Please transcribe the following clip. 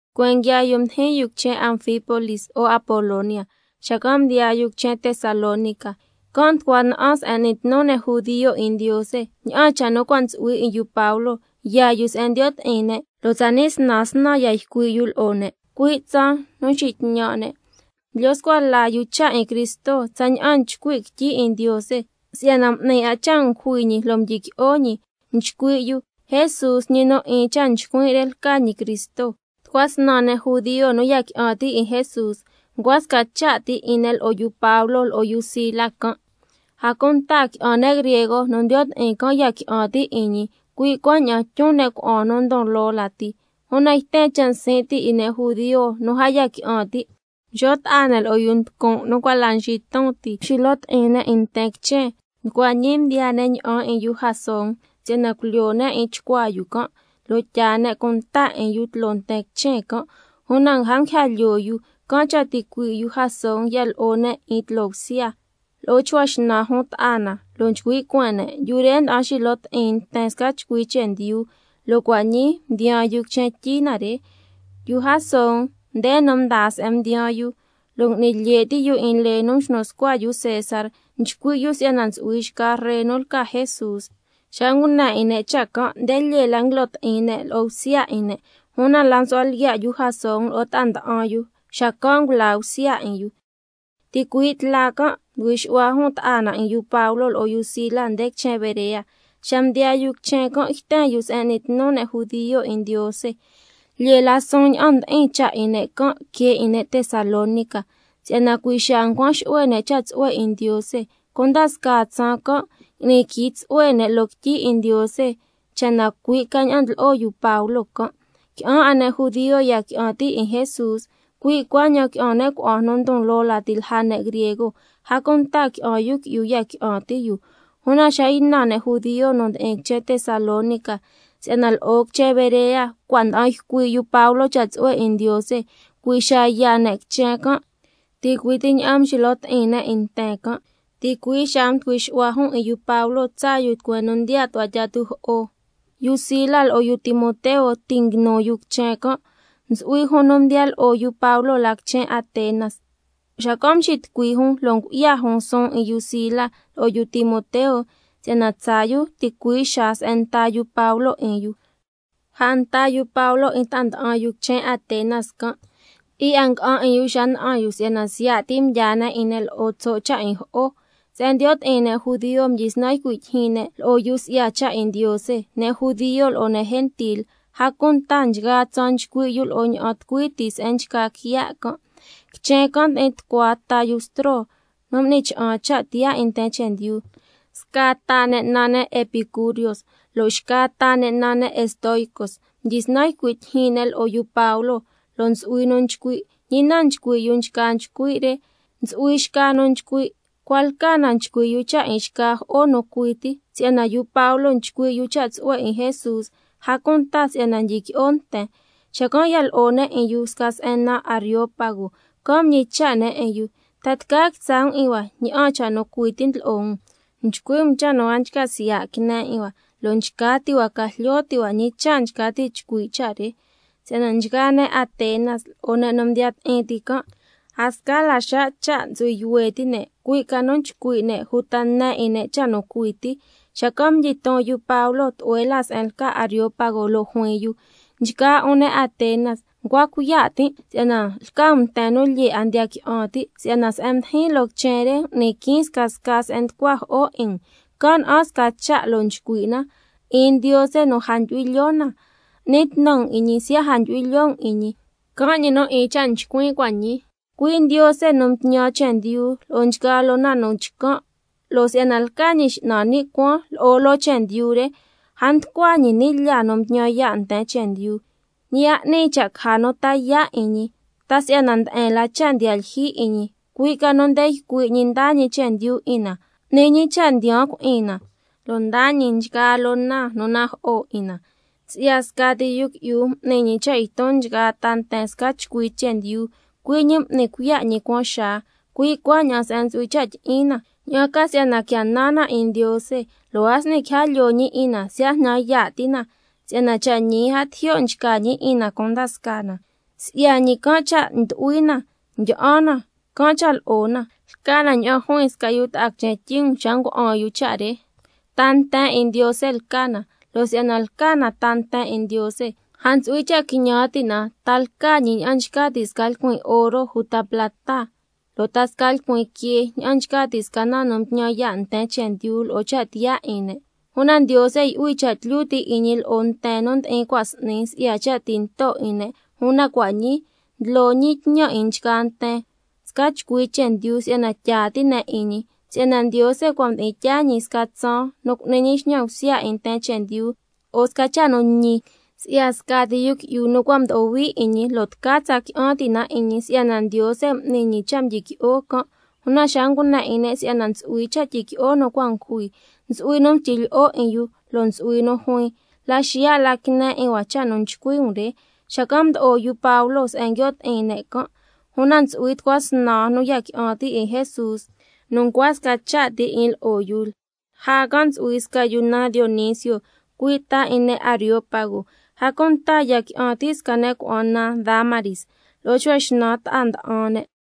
Tucueen nguiaa yu mdijin yu quichen Anfípolis lo'o Apolonia, xacan' mdiyaa yu quichen Tesalónica, can' nducua sca se'en n'ni tnu ne' judio 'in Ndiose. Ña'an cha' nu cua' ntsu'hui 'in yu Pablo yaa yu se'en ndiyo' ti'in ne' judio, lo' tsani' snan snan ya ycui' yu lo'o ne', cui' tsaan nu nxitñan' ne', ndlyo scua la yu cha' 'in Cristo tsaña'an nchcui' quityi 'in Ndiose, si'yana m'ni 'a cha' ngujui ñi lo' mdyiqui'o ñi. Nchcui' yu: Jesús, ñi nu 'in cha' nchcuin' re lca ñi Cristo. Tucua snan ne' judio nu ya qui'an ti' 'in Jesús, ncua sca cha' ti 'in ne' lo'o yu Pablo lo'o yu Sila can'. A cunta qui'an ne' griego nu ndiyo' ti'in can' ya qui'an ti' 'in ñi, cui' cuaña'an tyun ne' cuna'an nu ndon loo lati. Una yten cha' nsin' ti' 'in ne' judio nu a ya qui'an ti', mxo' ta'a ne' lo'o yu nducun' nu cua' la nxiton ti, lo' mxilo ti'in ne' nten quichen, nducua ñi mdiyaa ne' ña'an 'in yu Jasón si'yana culyoo ne' 'in chcuaa yu can', lo' tyaa ne' cunta 'in yu tloo nten quichen. Una a nguija lyoo yu, can' cha' ticuii' yu Jasón ya lo'o ne' 'in yu tloo bsya, lo'o chcua xnan jun ta'a na, lo' nchcui' cueen ne': Yu re nda'an nxilo ti'in nten sca chcui chendyu, lo' cua' ñii mdiyaan yu quichen tyi na re. Yu Jasón, nde nu mdaa se'en mdiyaan yu, lo' ngui'ni lye' ti' yu 'in lee nu mxnu scua yu César, nchcui' yu si'yana ntsu'hui xca ree 'in yu nu lca Jesús. Xa ngune 'in ne' cha' can', nde lyee la nguilo ti'in ne' lo'o bsya 'in ne'. Una la msu'hua lyiya' yu Jasón lo'o ta'a nda'an yu, xacan' ngulaa bsya 'in yu. Ticui' tla can' mducui xu'hua jun ta'a na 'in yu Pablo lo'o yu Sila nde quichen Berea. Xa mdiyaa yu quichen can' yten yu se'en n'ni tnu ne' judio 'in Ndiose. Lyee la suun ña'an ndi'in cha' 'in ne' can' que 'in ne' Tesalónica, si'yana cui' xaa ncuan xu'hue ne' cha' tsu'hue 'in Ndiose. Cunda scaa tsaan can' ngui'ni quii tsu'hue ne' loo quityi 'in Ndiose, cha' na cui' ca ña'an ndlo'o yu Pablo can'. Qui'an 'a ne' judio ya qui'an ti' 'in Jesús, cui' cuaña'an qui'an ne' cuna'an nu ndon loo lati lja ne' griego, a cunta qui'an yu qui'yu ya qui'an ti' yu. Una xa ynan ne' judio nu ndi'in quichen Tesalónica si'yana lo'o quichen Berea cua' nda'an ycui' yu Pablo cha' tsu'hue 'in Ndiose, cui' xaa yaa ne' quichen can', ticui' ti ña'an mxilo ti'in ne' 'in nten can'. Ticui' xaa mducui xu'hua jun 'in yu Pablo tsaa yu tucueen nu ndiyaa tu'hua tyi'a tujo'o. Yu Sila lo'o yu Timoteo ti' nguinu yu quichen can'. Ntsu'hui jun nu mdiya lo'o yu Pablo la quichen Atenas. Xacan' mxitucui jun lo' ngu'ya jun suun 'in yu Sila lo'o yu Timoteo, si'yana tsaa yu ticui' xaa se'en nta yu Pablo can' 'in yu. Lja nta yu Pablo 'in ta'a nda'an yu quichen Atenas can', ti'i 'a nga'an 'in yu xa na'an yu si'yana siya' ti mdyaa ne' 'in ne' lo'o tso' cha' 'in jo'o. Se'en ndiyo' ti'in ne' judio mdyisnan ycui' tyijyin ne' lo'o yu si'ya cha' 'in Ndiose, ne' judio lo'o ne' gentil, a cunta nchgaa tsaan nchcui' yu lo'o ña'an tucui ti se'en nchca quiya' can'. Quichen can' ndi'in tucua ta yu bstro nu m'ni cha'an cha' tiyaa 'in nten chendyu, sca ta ne' naan ne' epicurios, lo' xca ta ne' naan ne' estoicos. Mdyisnan ycui' tyijyin ne' lo'o yu Pablo, lo' ntsu'hui nu nchcui': ¿Ñi na nchcui' yu nchca nchcui' re? Ntsu'hui xca nu nchcui': Cua' lca na nchcui' yu cha' 'in xca jo'o nu cui ti. Si'yana yu Pablo nchcui' yu cha' tsu'hue 'in Jesús, a cunta si'yana ndyiqui'o nten. Xacan' ya lo'o ne' 'in yu sca se'en naan Areópago, can' mñicha' ne' 'in yu: ¿Ta tca quitsa' um 'in hua ña'an cha' nu cui ti ndlo'o um? Si'yana nchcui' um cha' nu a nchca siya' quine 'in hua, lo' nchca ti' hua ca jlyo ti' hua ñi cha' nchca ti' chcui' cha' re. (Si'yana nchgaa ne' Atenas lo'o ne' nu mdiya ti'in ti can', a sca la xa' cha' ntsu'hui yuhue ti' ne', cui' ca nu nchcui' ne' uta ne 'in ne' cha' nu cui ti.) Xacan' mdyiton yu Pablo tlu'hue la se'en lca Areópago, lo' juin yu: Nchgaa 'un ne' Atenas, ncua cuiya' tin' si'yana lca um nten nu lyee 'a ndiya qui'an ti'. Si'yana se'en mdijin loo quichen re m'nin quiin scasca se'en nducua jo'o 'in um, can' na'an sca cha' lo' nchcui' na: 'IN NDIOSE NU A NDYU'HUI LYOO NA. N'ni tnu um 'in ñi siya' a ndyu'hui lyoo um 'in ñi, can' ñi nu 'in cha' nchcuin' cua' ñii, cui' Ndiose nu mtñan chendyu lo'o nchgaa loo na nu chcan', lo' si'yana lca ñi X'nan ni' cuaan lo'o loo chendyu re, a nducua ñi ni' lyaa nu mtñan yaa' nten chendyu. Ñi a 'ni cha' caja nu ta yaa' 'in ñi, ta si'yana nde'en la cha' ndiya lyijyi 'in ñi, cui' ca nu nde ycui' ñi ndaa ñi chendyu 'in na, n'ni ñi cha' ndiyaan cui'in na, lo' ndaa ñi nchgaa loo na nu najo'o 'in na. Si'ya scati yu qui'yu, m'ni ñi cha' yton nchgaa ta nten si'yana tyi'in ne' sca chcui chendyu, cui' ñi m'ni cuiya' ñi cuaan xaa, cui' cuaña'an se'en ntsu'hui cha' tyi'in na, ña'an ca si'yana quia nan na 'in Ndiose, lo' a s'ni quija lyoo ñi 'in na, siya' jnan yaa' ti na, si'yana cha' ñi a tijyo' nchca ñi 'in na cunda scaa na. Si'ya ñi can' cha' ndu'hui na, ndyi'an na, can' cha' lo'o na. Lca na ña'an juin sca yu ta'a quichen tyi um xa ngua'an yu cha' re: Ta nten 'in Ndiose lca na. Lo' si'yana lca na ta nten 'in Ndiose, a ntsu'hui cha' quiñan ti' na, ta lca ñi ña'an nchca ti' sca lcuin oro uta plata, lo' ta sca lcuin quee, ña'an nchca ti' sca na nu ntñan yaa' nten chendyu lo'o cha' tiyaa 'in ne'. Una Ndiose yu'hui cha' tlyu ti' 'in ñi lo'o nten nu mdi'in cua' s'ni si'ya cha' tinto 'in ne', una cua' ñii ndlo ñi tñan 'in nchgaa nten sca chcui chendyu si'yana tyaa ti' ne' 'in ñi. Si'yana Ndiose cua' mdi'in tyaa ñi sca tsaan nu cu'ni ñi xñan bsya 'in nten chendyu lo'o sca cha' nu ñi, si'ya scati yu qui'yu nu cua' mdo'o hui 'in ñi, lo' tca tsa qui'an ti' na 'in ñi, si'yana Ndiose m'ni ñi cha' mdyiqui'o can'. Una xa ngune 'in ne' si'yana ntsu'hui cha' tyiqui'o ne' cua' ngujui, ntsu'hui nu mstyi lyi'o 'in yu, lo' ntsu'hui nu juin: La xiya' la quine 'in hua cha' nu nchcui' um re. Xacan' mdo'o yu Pablo se'en nguio' ti'in ne' can'. Una ntsu'hui tucua snan nu ya qui'an ti' 'in Jesús nu ncua sca cha' ti 'in lo'o yu. Lja can' ntsu'hui sca yu naan Dionisio, cui' ta 'in ne' Areópago, a cunta ya qui'an ti' sca ne' cuna'an naan Dámaris, lo'o chcua xnan ta'a nda'an ne'.